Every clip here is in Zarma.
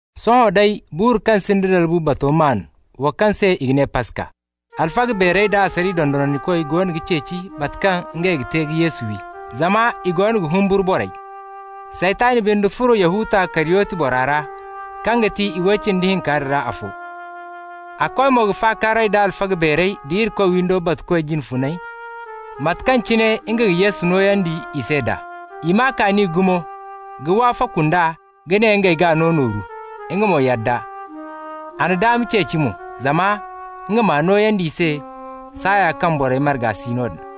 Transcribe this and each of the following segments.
Sohõ day, buuru kaŋ sinda dalbu bato maan, wo kaŋ se i ga ne Paska. Alfaga beerey da asariya dondonandikoy goono ga ceeci mate kaŋ ngey ga te ka Yesu wi, zama i goono ga humburu borey. Saytan binde furo Yahuta Kariyoti bora ra, kaŋ ga ti i way cindi hinka din ra afo. A koy mo ka fakaaray da alfaga beerey da Irikoy windo batukoy jine funey, mate kaŋ cine nga ga Yesu nooyandi i se d'a. I maa kaani gumo ka wafaku nd'a ka ne ngey g'a no nooru. Nga mo yadda. A na daama ceeci mo, zama nga m'a nooyandi i se saaya kaŋ borey marga si noodin.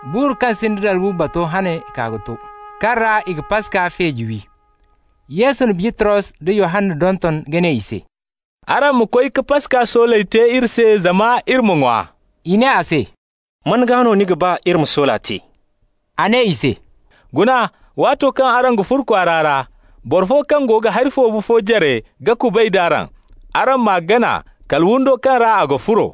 Buuru kaŋ sinda dalbu bato hane kaa ka to, kaŋ ra i ga Paska feeji wi. Yesu na Bitros da Yohanna donton ka ne i se: «Araŋ ma koy ka Paska sooley te iri se zama iri ma ŋwa.» I ne a se: «Man gaa no ni ga ba iri ma soola te?» A ne i se: «Guna, waato kaŋ araŋ ga furo kwaara ra, boro fo kaŋ go ga hari foobu fo jare ga kubay d'araŋ. Araŋ m'a gana kala windo kaŋ ra a ga furo.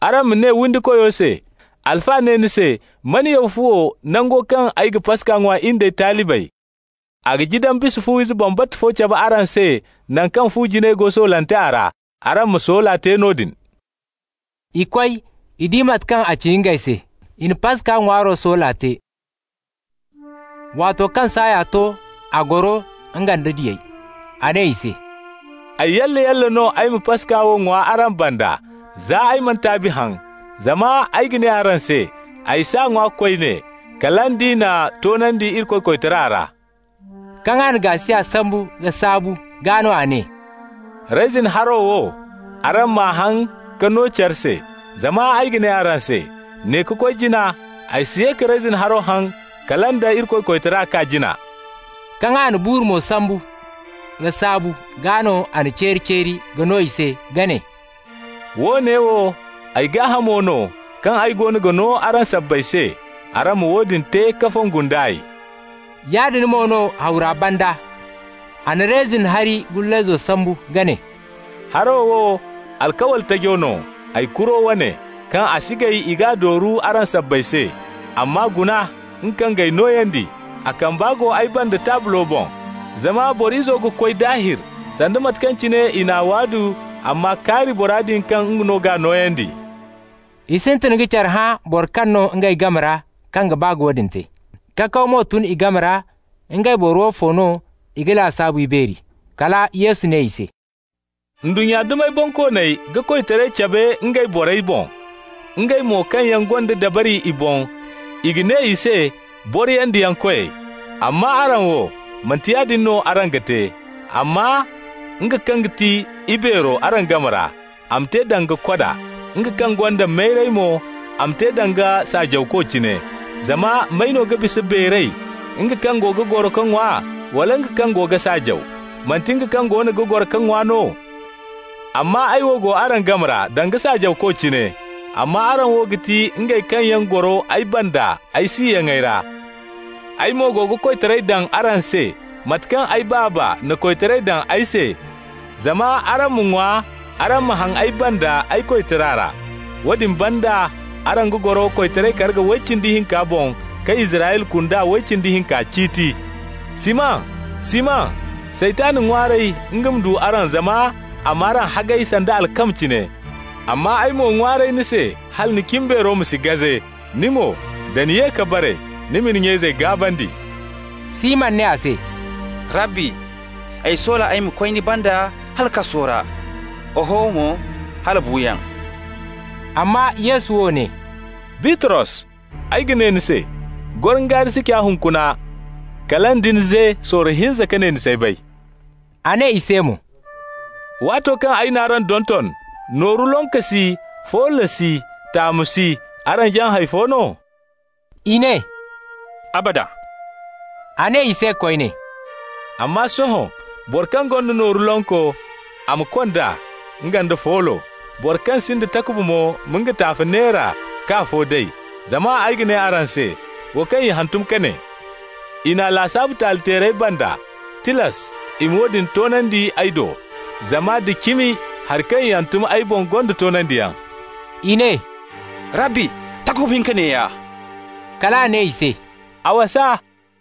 Araŋ ma ne windikoyo se: ‹Alfa ne ni se: Man yaw fuwo, nango kaŋ ay ga Paska ŋwa, in d'ay talibey?› A ga jidan bisa fu-ize bambata fo cabe araŋ se naŋ kaŋ fu jinay go soolante a ra. Araŋ ma soola te noodin.» I koy. I di mate kaŋ a ci ngey se. I na Paska ŋwaaro soola te. Waato kaŋ saaya to, a goro, nga nda diyey. A ne i se: «Ay yalla-yalla no ay ma Paska wo ŋwa araŋ banda, za ay mana taabi haŋ. Zama ay ga ne araŋ se: ay s'a ŋwa koyne, kala nd'i n'a toonandi Irikoy koytara ra.» Kaŋ a na gaasiya sambu ka saabu, gaa no a ne: «Reyzin haro wo, araŋ m'a haŋ ka no care se. Zama ay ga ne araŋ se: ne ka koy jina ay si ye ka reyzin haro haŋ kala nda Irikoy koytara kaa jina.» Kaŋ a na buuru mo sambu ka saabu, gaa no a n'a ceeri-ceeri ka no i se, ka ne: «Woone wo ay gaahamo no kaŋ ay goono ga no araŋ sabbay se. Araŋ ma woodin te ka fongu nd'ay.» Yaadin mo no hawra banda, a na reyzin hari gullayzo sambu ka ne: «Haro wo alkawli tajo no, ay kuro wane, kaŋ a si gay i g'a dooru araŋ sabbay se. Amma guna, nga kaŋ g'ay nooyandi, a kamba go ay banda taablo boŋ. Zama Boro Izo ga koy daahir, sanda mate kaŋ cine i n'a waadu amma kaari bora din kaŋ nga no g'a nooyandi!» I sintin ka care hã boro kaŋ no ngey game ra kaŋ ga ba ka woodin te. Kakaw mo tun i game ra ngey boro woofo no i g'a lasaabu ibeeri. Kala Yesu ne i se: «Ndunnya dumey bonkooney ga koytaray cabe ngey borey boŋ. Ngey mo kaŋ yaŋ gonda dabari i boŋ, i ga ne i se: boriyandiyankoyey. Amma araŋ wo, manti yaadin no araŋ ga te, amma nga kaŋ ga ti ibeero araŋ game ra, a ma te danga koda. Nga kaŋ gonda mayray mo, a ma te danga saajawko cine. Zama may no ga bisa beeray, nga kaŋ go ga goro ka ŋwa, wala nga kaŋ go ga saajaw? Manti nga kaŋ goono ga goro ka ŋwa no? Amma ay wo go araŋ game ra danga saajawko cine. Amma araŋ wo ga ti ngey kaŋ yaŋ goro ay banda ay siyaŋey ra. Ay mo go ga koytaray daŋ araŋ se, mate kaŋ ay Baaba na koytaray daŋ ay se, zama araŋ ma ŋwa, araŋ ma haŋ ay banda ay koytara ra. Woodin banda, araŋ ga goro koytaray karga way cindi hinka boŋ ka Israyla kunda way cindi hinka ciiti. Siman, Siman, Saytan ŋwaaray nga ma du araŋ zama a m'araŋ hagay sanda alkama cine. Amma ay mo ŋwaaray ni se hala ni cimbeero ma si gaze. Ni mo, da ni ye ka bare, ni ma ni nya-izey gaabandi.» Siman ne a se: «Rabbi, ay soola ay ma koy ni banda hala kasu ra; oho mo, hala buuyaŋ.» Amma Yesu wo ne: «Bitros, ay ga ne ni se: gorongaari si ca hunkuna, kala nda ni ze sorro hinza ka ne ni s'ay bay.» A ne i se mo: «Waato kaŋ ay n'araŋ donton nooru lonko si, foolo si, taamu si, araŋ jaŋ hay fo no?» I ne: «Abada!» A ne i se koyne: «Amma sohõ, boro kaŋ gonda nooru lonko, a ma kond'a, nga nda foolo. Boro kaŋ sinda takuba mo ma nga taafe neera k'afo day. Zama ay ga ne araŋ se: Wo kaŋ i hantum ka ne: ‹I n'a lasaabu taali-teerey banda,› tilas i ma woodin toonandi ay do. Zama da cimi hari kaŋ i hantum ay boŋ gonda toonandiyaŋ.» I ne: «Rabbi, takuba hinka neeya.» Kal a ne i se: «A wasa.»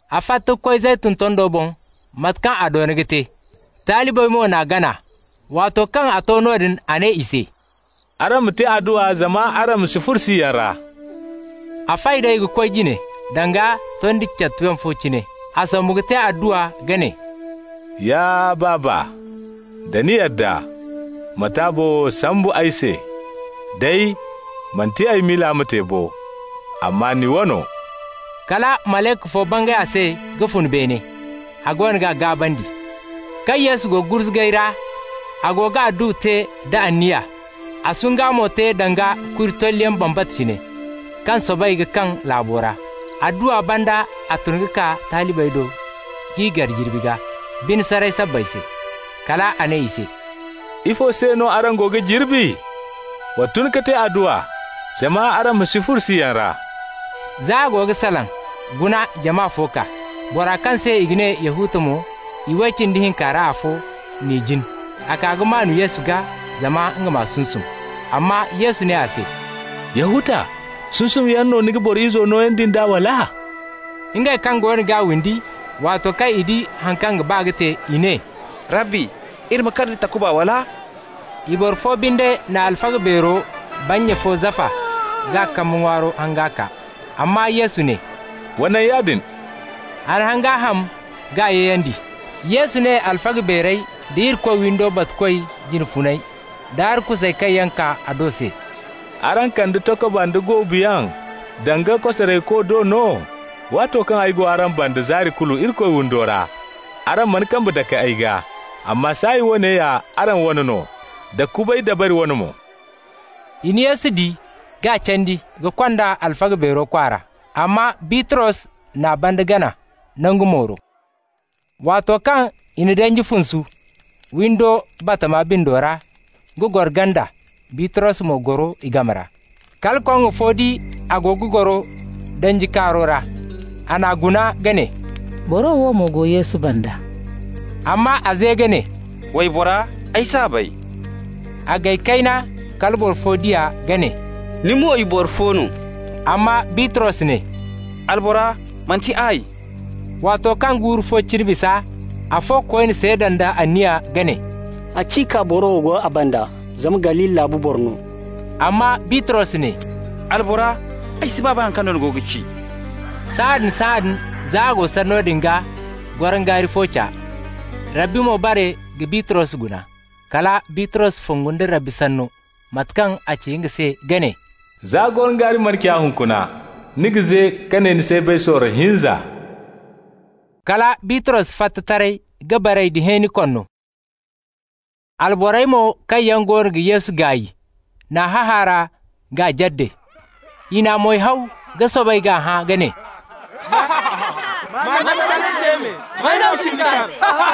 A fatta ka koy Zeytun tondo boŋ, mate kaŋ a doona ka te, talibey mo n'a gana. Waato kaŋ a to noodin, a ne i se: «Araŋ ma te adduwa zama araŋ ma si furo siyaŋ ra.» A fay d'ey ka koy jine danga tondi catuyaŋ fo cine. A sombu ka te adduwa, ka ne: «Ya Baaba, da ni yadda, ma taabo wo sambu ay se. Day, manti ay miila ma te bo, amma ni wano.» Kala malayka fo bangay a se ka fun beene, a goono g'a gaabandi. Kaŋ Yesu go gurzugay ra, a go ga adduwa te da anniya, a sungay mo te danga kuri tolliyaŋ bambata cine, kaŋ soobay ka kaŋ laabo ra. Adduwa banda a tun ka kaa talibey do k'i gar jirbi gaa, bine saray sabbay se. Kal a ne i se: «Ifo se no araŋ go ga jirbi? Wa tun ka te adduwa, zama araŋ ma si furo siyaŋ ra.» Za a go ga salaŋ, guna jama fo kaa. Bora kaŋ se i ga ne Yahuta mo, i way cindi hinka ra afo, n'i jin. A kaa ka maan Yesu gaa, zama nga m'a sunsum. Amma Yesu ne a se: «Yahuta, sunsumyaŋ no ni ga Boro Izo nooyandi nd'a, wala?» Ngey kaŋ goono g'a windi, waato kaŋ i di haŋ kaŋ ga ba ka te, i ne: «Rabbi, iri ma kar da takuba, wala?» I boro fo binde na alfaga beero bannya fo zafa k'a kambe ŋwaaro hanga kaa. Amma Yesu ne: «Wa naŋ yaadin.» A na hanga ham k'a yayandi. Yesu ne alfaga beerey da Irikoy windo batukoy jine funey da arkusey kaŋ yaŋ kaa a do se: «Araŋ kande takuba nda goobu yaŋ danga kosarayko do no? Waato kaŋ ay go araŋ banda zaari kulu Irikoy windo ra, araŋ mana kambe dake ay gaa. Amma saaya woone ya araŋ wane no, da kubay dabari wane mo.» I na Yesu di k'a candi ka kond'a alfaga beero kwaara. Amma Bitros n'a banda gana nangu mooro. Waato kaŋ i na danji funsu windo batama bindo ra ka goro ganda, Bitros mo goro i game ra. Kala koŋŋo fo di a go ga goro danji kaaro ra. A n'a guna ka ne; «Boro wo mo go Yesu banda.» Amma a ze ka ne: «Waybora, ay s'a bay.» A gay kayna, kala boro fo di a ka ne: «Ni mo i boro fo no.» Amma Bitros ne: «Albora, manti ay.» Waato kaŋ guuru fo cine bisa, afo koyne seeda nda anniya ka ne: «Haciika boro wo go a banda, zama Galili laabu boro no.» Amma Bitros ne: «Albora, ay si baa bay haŋ kaŋ no ni go ga ci.» Sahãadin-sahãadin, za a go sanno din gaa, gorongaari fo ca. Rabbi mo bare ka Bitros guna. Kala Bitros fongu nda Rabbi sanno, mate kaŋ a ci nga se ka ne: «Za gorongaari mana ca hunkuna, ni ga ze ka ne ni s'ay bay sorro hinza.» Kala Bitros fatta taray ka baray da hẽeni konno. Alborey mo kaŋ yaŋ goono ga Yesu gaay n'a hahaara k'a jadde. I n'a moy haw ka soobay k'a hã ka ne: «Ma annabitaray te me, may no ka ni kar?»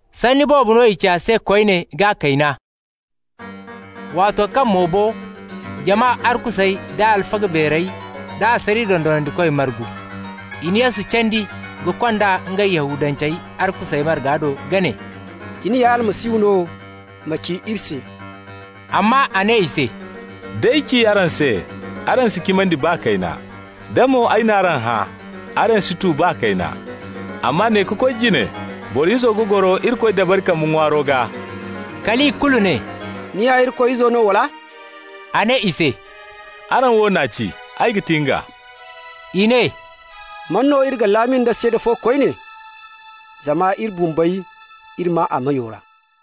Sanni boobo no i ci a se koyne k'a kayna. Waato kaŋ mo bo, jama arkusey da alfaga beerey da asariya dondonandikoy margu. I na Yesu candi ka kond'a ngey Yahudancey arkusey marga do ka ne: «Da ni ya Almasihu no, ma ci iri se.» Amma a ne i se: «D'ay ci araŋ se, araŋ si cimandi baa kayna. Da mo ay n'araŋ hã, araŋ si tu baa kayna. Amma ne ka koy jine Boro Izo ga goro Irikoy dabari kambe ŋwaaro gaa.» Kal i kulu ne: «Ni ya Irikoy Izo no, wala?» A ne i se: «Araŋ wo n'a ci, ay ga ti nga.» I ne: «Man no iri ga laami nda seeda fo koyne? Zama iri bumbey, iri maa a meyo ra.»